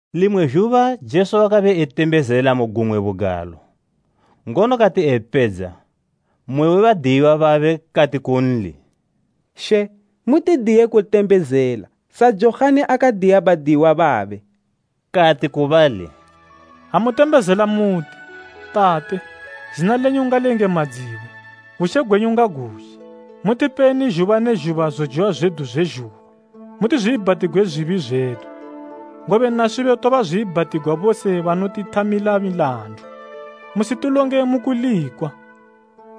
Limwe zhuba Jesu wakabe etembezela mu gumwe bugalo, ngono kati epedza, mmwe we badiyiwa babe kati kunli, “She, mutidiye kutembezela, sa Johani akadiya badiyiwa babe.” Kati ku bali, “Ha mutembezela muti, “ ‘Tate, zina lenyu ngaliyengamadziwe, bushe gwenyu ngaguzhe. Mutipeni zhuba ne zhuba zojiwa zwedu zwe zhuba. Mutizwiibhatigwe zwibi zwedu, ngobe naswibo tobazwiibhatigwa bose banotithamila milandu. Musitilonge mu kulikwa.’”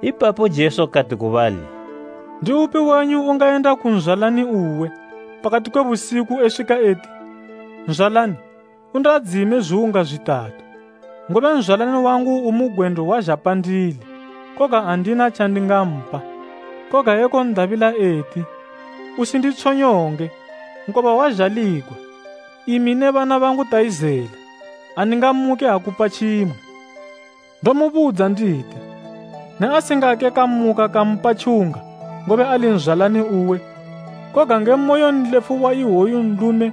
Ipapo Jesu kati ku bali, “Ndiupi wenyu ungayenda ku nzwalani uwe, pakati kwe busiku eswika eti ‘Nzwalani, undiadzime zwiwunga zwitatu, ngobe nzwalani wangu umu gwendo wazha pandili, koga andina tjandingampa,’ koga ekon'dabila eti, ‘Usinditshonyonge, nkoba wazhaligwa imi ne bana bangu tayizela. Andingamuke akupa tjimwe kene?’ Ndomubudza nditi, ne asingake kamuka kampa tjiwunga, ngobe ali nzwalani uwe, koga nge moyo nlefu wa iwoyu nlume,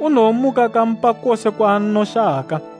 unowomuka kampa kose kwaanoshaka.”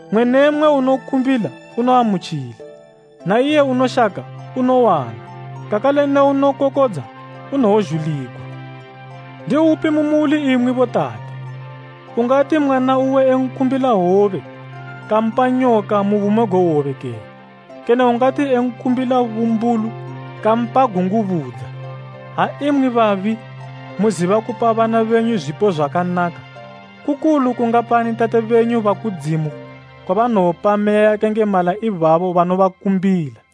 Mmwe ne mmwe unokumbila unoamutjila, na iye unoshaka unowana, kakale ne unokokodza, unowozhuligwa. Ndiupi mu muli imwi botate, ungati mwana uwe ekumbila hwobe, kampa nyoka mu bumo gwe hwobe kene? Kene ungati ekumbila bumbulu, kampa gungubudza? Ha imwi babi, muziba kupa bana benyu zwipo zwakanaka, kukulu kungapani Tate benyu ba kudzimu kwabanowopa Meya yakayengemala ibabo banobakumbila!”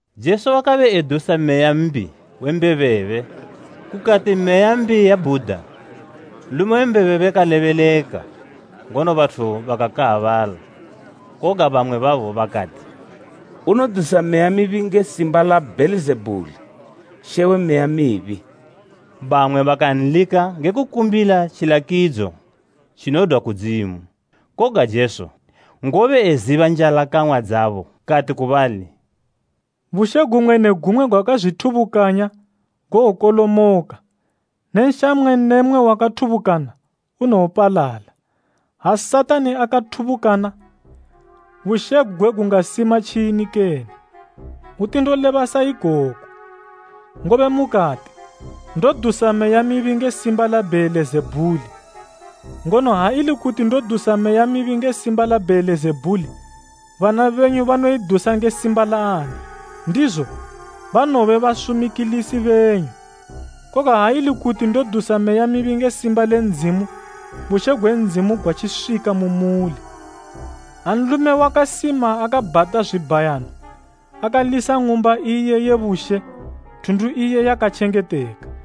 Jesu wakabe edusa meya mbi we mbebebe. Kukati meya mbi yabhuda, nlume we mbebebe kalebeleka, ngono bathu bakakaabala. Koga bamwe babo bakati, “Unodusa meya mibi nge simba la Bheelizebhuli, she we meya mibi.” Bamwe bakanlika nge kukumbila tjilakidzo tjinodwa kudzimu. Koga Jesu, ngobe eziba njalakang'wa dzabo kati ku bali, “Bushe gumwe ne gumwe gwakazwithubukanya, gowokolomoka ne nsha mmwe ne mmwe wakathubukana, unowopalala. Ha Satani akathubukana, bushe gugwe gungasima tjini kene? Hwuti ndoleba saikoku ngobe mukati ndodusa meya mibi nge simba la Bheelizebhuli. Ngono ha ili kuti ndodusa meya mibi nge simba la Bheelizebhuli, bana benyu banoidusa nge simba la ani? Ndizo banowobe basumikilisi benyu. Koga ha ili kuti ndodusa meya mibi nge simba le Ndzimu, bushe gwe Ndzimu gwatjiswika mu muli.” “Ha nlume wakasima akabhata zwibhayano, akalisa ng'umba iye ye bushe, thundu iye yakatjengeteka.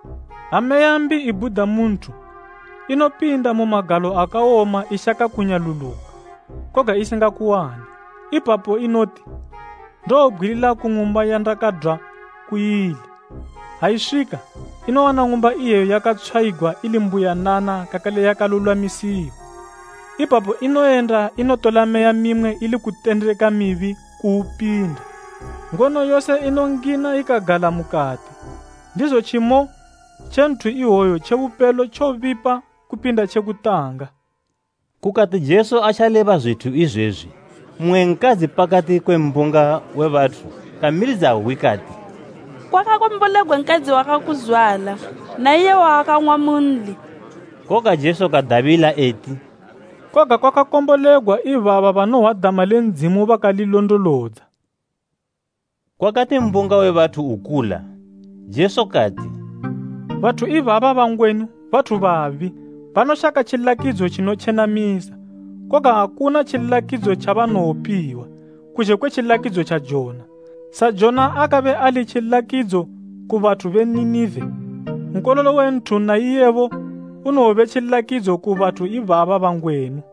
“Ha meya mbi ibhuda mu nthu, inopinda mu magalo akawoma ishaka kunyaluluka, koga isingakuwane. Ipapo inoti, ‘Ndowobgwilila ku ng'umba yandakadwa ku ili.’ Ha iswika, inowana ng'umba iyeyo yakatshwayigwa ili mbuyanana kakale yakalulwamisiwa. Ipapo inoyenda inotola meya mimwe ili kutendeka mibi kuupinda, ngono yose inongina ikagala mukati, ndizo tjimo tje nthu iwoyo tje bupelo tjobipa kupinda tje kutanga.” Kukati Jesu atjaleba zwithu izwezwi, mmwe nkadzi pakati kwe mbunga we bathu kamilidza hwi kati, “Kwakakombolegwa nkadzi wakakuzwala na iye wawakamwa munli.” Koga Jesu kadabila eti, “Koga kwakakombolegwa ibaba banohwa dama le Ndzimu bakalilondolodza.” Kwakati mbunga we bathu ukula, Jesu kati, “Bathu ibaba bangwenu bathu babi. Banoshaka tjilakidzo tjinotjenamisa, koga akuna tjilakidzo tjabanowopiwa, kuzhe kwe tjilakidzo tja Jona. Sa Jona akabe ali tjilakidzo ku bathu be Ninive, Nkololo we Nthu na iye unowobe tjilakidzo ku bathu ibaba bangwenu.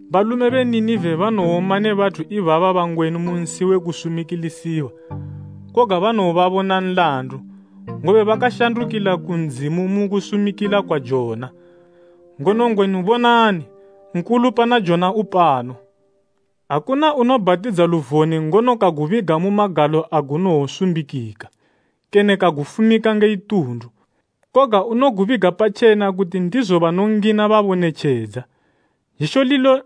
Balume be Ninive banowoma ne bathu ibaba bangwenu mu nsi we kusumikilisiwa, koga banowobabona nlandu, ngobe bakashandukila ku Ndzimu mu kusumikila kwa Jona, ngono ngwenu bonani, nkulu pana Jona upano.” “Akuna unobhatidza luvone, ngono kagubiga mu magalo agunowosumbikika, kene kagufumika nge itundu. Koga unogubiga patjena kuti ndizo banongina babone tjedza. Zhisho lilo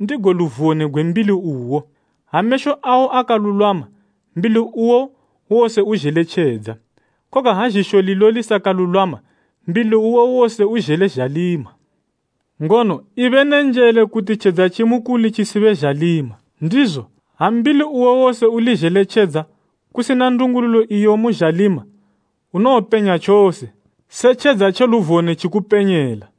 ndigo luvone gwe mbili uwo. Ha mesho awo akalulwama, mbili uwo wose uzhele tjedza. Koga ha zhisho lilo lisakalulwama, mbili uwo wose uzhele zhalima. Ngono ibe ne njele kuti tjedza tjimukuli tjisibe zhalima. Ndizo, ha mbili uwo wose uli zhele tjedza, kusina ndungululo iyo imu zhalima, unowopenya tjose, se tjedza tje luvone tjikupenyela.”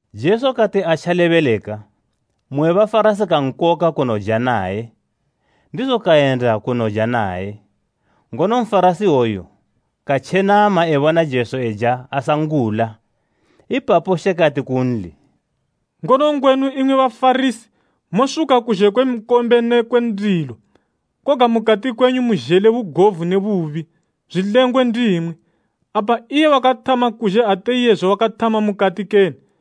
Jesu kati atjalebeleka, mmwe we Bafarasi kankoka kunoja naye, ndizo kayenda kanoja naye. Ngono Nfarasi iwoyu katjenama ebona Jesu eja asangula. Ipapo She kati kunli, “Ngono ngwenu imwi Bafarasi mosuka kuzhe kwe nkombe ne kwe ndilo, koga mukati kwenyu muzhele bugovu ne bubi. Zwilengwe ndimwi! Apa iye wakathama kuzhe ate iyezwe wakathama mukati kene?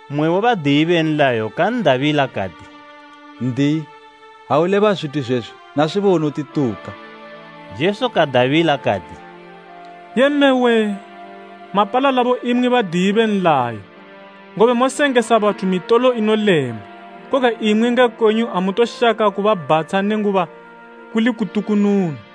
Mmwe we badiyi be nlayo kan'dabila kati, “N'diyi, ha uleba zwithu izwezwi, naswibo unotituka.” Jesu kadabila kati, “Yee mme wee! Mapalalabo imwi badiyi be nlayo, ngobe mosengesa bathu mitolo inolema, koga imwi nge kwenyu amutoshaka kubabhatsha nenguba kuli kutukununu.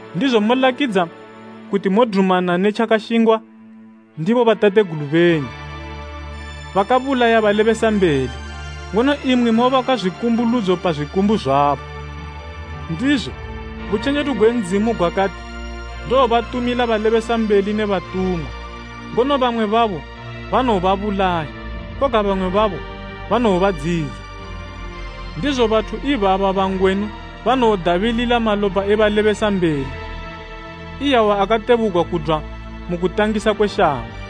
Ndizo molakidza kuti modumana ne tjakashingwa ndi bobatategulu benyu, bakabulaya balebesambeli, ngono imwi mobaka zwikumbuludzo pa zwikumbu zwabo. Ndizo, butjenjedu gwe Ndzimu gwakati, ‘Ndowobatumila balebesambeli ne batumwa, ngono bamwe babo banowobabulaya, koga bamwe babo banowobadziyidza.’ Ndizo bathu ibaba ba ngwenu banowodabilila malopa e balebesambeli, iyawa akatebugwa kudwa mu kutangisa kwe shango,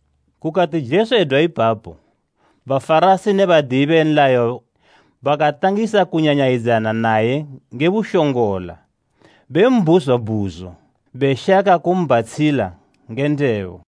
Kukati Jesu edwa ipapo, Bafarasi ne badiyi be nlayo bakatangisa kunyanyayidzana naye nge bushongola, bembhuzwa bhuzo, beshaka kumbhatshila nge ndebo.